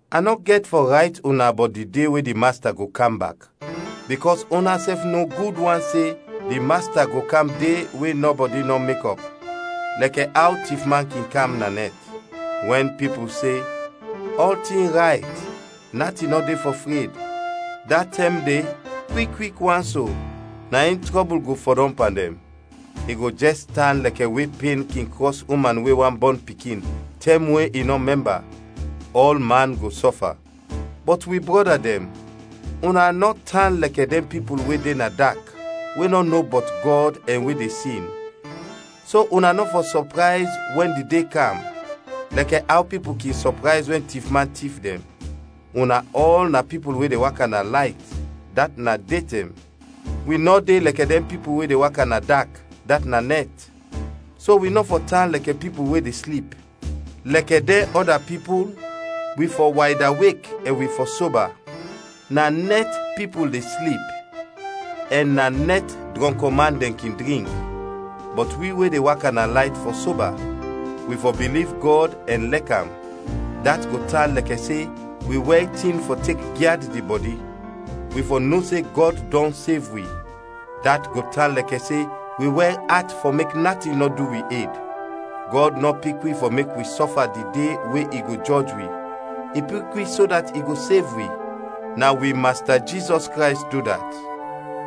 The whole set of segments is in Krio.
A nɔ gɛt fɔ rayt una bɔt di de we di Masta go kam bak, bikɔs unasɛf no gud wan se di Masta go kam de we nɔbɔdi nɔ mekɔp, lɛkɛ aw tifman kin kam na nɛt. Wɛn pipul se, “Ɔltin rayt, natin nɔ de fɔ fred,” da tɛm de kwik, kwik wan so, na in trɔbul go fɔdɔm pan dɛn. I go jɛs tan lɛkɛ we pen kin krɔs uman we wan bɔn pikin, tɛm we i nɔ mɛmba. Ɔlman go sɔfa. Bɔt wi brɔda dɛn, una nɔ tan lɛkɛ dɛn pipul we de na dak, we nɔ no bɔt Gɔd ɛn we de sin, so una nɔ fɔ sɔprayz wɛn di De kam, lɛkɛ aw pipul kin sɔprayz wɛn tifman tif dɛn. Una ɔl na pipul we de waka na layt, dat na detɛm. Wi nɔ de lɛkɛ dɛn pipul we de waka na dak, dat na nɛt. So wi nɔ fɔ tan lɛkɛ pipul we de slip, lɛkɛ dɛn ɔda pipul, wi fɔ waydawek ɛn wi fɔ soba. Na nɛt pipul de slip ɛn na nɛt drɔnkman dɛn kin drink. Bɔt wi we de waka na layt fɔ soba. Wi fɔ biliv Gɔd ɛn lɛk am: dat go tan lɛkɛ se wi wɛr tin fɔ tek gyad di bɔdi. Wi fɔ no se Gɔd dɔn sev wi: dat go tan lɛkɛ se wi wɛr at fɔ mek natin nɔ du wi ed. Gɔd nɔ pik wi fɔ mek wi sɔfa di de we i go jɔj wi, i pik wi so dat i go sev wi; na wi Masta Jizɔs Krays du dat.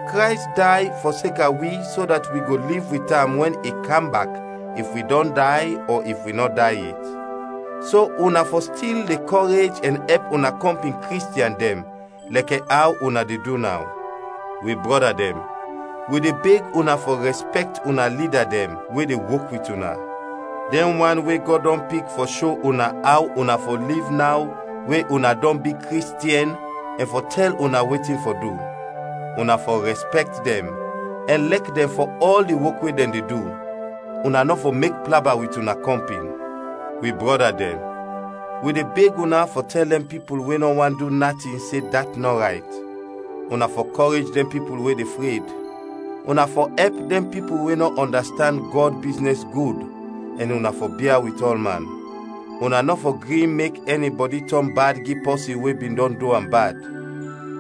Krays day fɔseka wi so dat wi go liv wit am, wɛn i kam bak if wi dɔn day ɔ if wi nɔ day yet. So una fɔ stil de kɔrej ɛn ɛp una kɔmpin Kristiɛn dɛn, lɛkɛ aw una de du naw. Wi brɔda dɛn, wi de beg una fɔ rɛspɛkt una lida dɛn we de wok wit una, dɛn wan we Gɔd dɔn pik fɔ sho una aw una fɔ liv naw we una dɔn bi Kristiɛn ɛn fɔ tɛl una wetin fɔ du. Una fɔ rɛspɛkt dɛn ɛn lɛk dɛn fɔ ɔl di wok we dɛn de du. Una nɔ fɔ mek plaba wit una kɔmpin. Wi brɔda dɛn, wi de beg una fɔ tɛl dɛn pipul we nɔ want du natin se dat nɔ rayt, una fɔ kɔrej dɛn pipul we de fred, una fɔ ɛp dɛn pipul we nɔ ɔndastand Gɔd biznɛs gud, ɛn una fɔ bia wit ɔlman. Una nɔ fɔ gri mek ɛnibɔdi tɔn bad gi pɔsin we bin dɔn du am bad,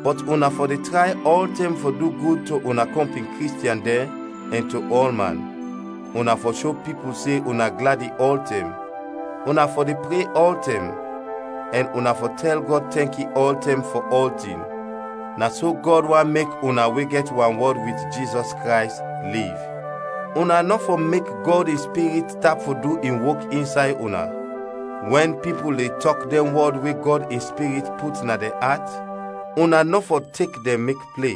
bɔt una fɔ de tray ɔltɛm fɔ du gud to una kɔmpin Kristiɛn dɛn ɛn to ɔlman. Una fɔ sho pipul se una gladi ɔltɛm, una fɔ de pre ɔltɛm, ɛn una fɔ tɛl Gɔd tɛnki ɔltɛm fɔ ɔltin. Na so Gɔd want mek una we gɛt wanwɔd wit Jizɔs Krays, liv. Una nɔ fɔ mek Gɔd in Spirit tap fɔ du in wok insay una; wɛn pipul de tɔk dɛn wɔd we Gɔd in Spirit put na dɛn at, una nɔ fɔ tek dɛn mek ple.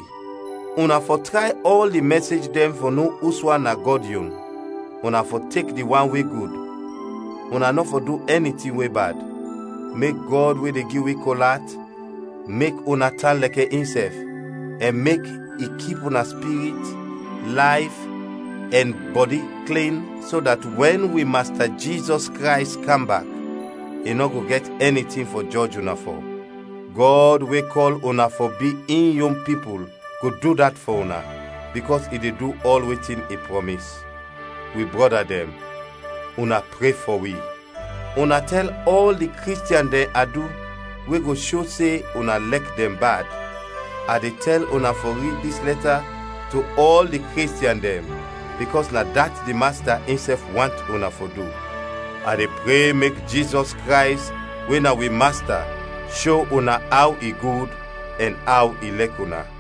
Una fɔ tray ɔl di mɛsej dɛn fɔ no uswan na Gɔd yon. Una fɔ tek di wan we gud. Una nɔ fɔ du ɛni tin we bad. Mek Gɔd we de gi wi kol at mek una tan lɛkɛ insɛf, ɛn mek i kip una spirit, layf, ɛn bɔdi klin so dat wɛn wi Masta Jizɔs Krays kam bak, i nɔ go gɛt ɛni tin fɔ jɔj una fɔ. Gɔd we kɔl una fɔ bi in yon pipul go du dat fɔ una, bikɔs i de du ɔl wetin i prɔmis. Wi brɔda dɛn, una pre fɔ wi. Una tɛl ɔl di Kristiɛn dɛn adu we go sho se una lɛk dɛn bad. A de tɛl una fɔ rid dis lɛta to ɔl di Kristiɛn dɛn, bikɔs na dat di Masta insɛf want una fɔ du. A de pre mek Jizɔs Krays we na wi Masta sho una aw i gud ɛn aw i lɛk una.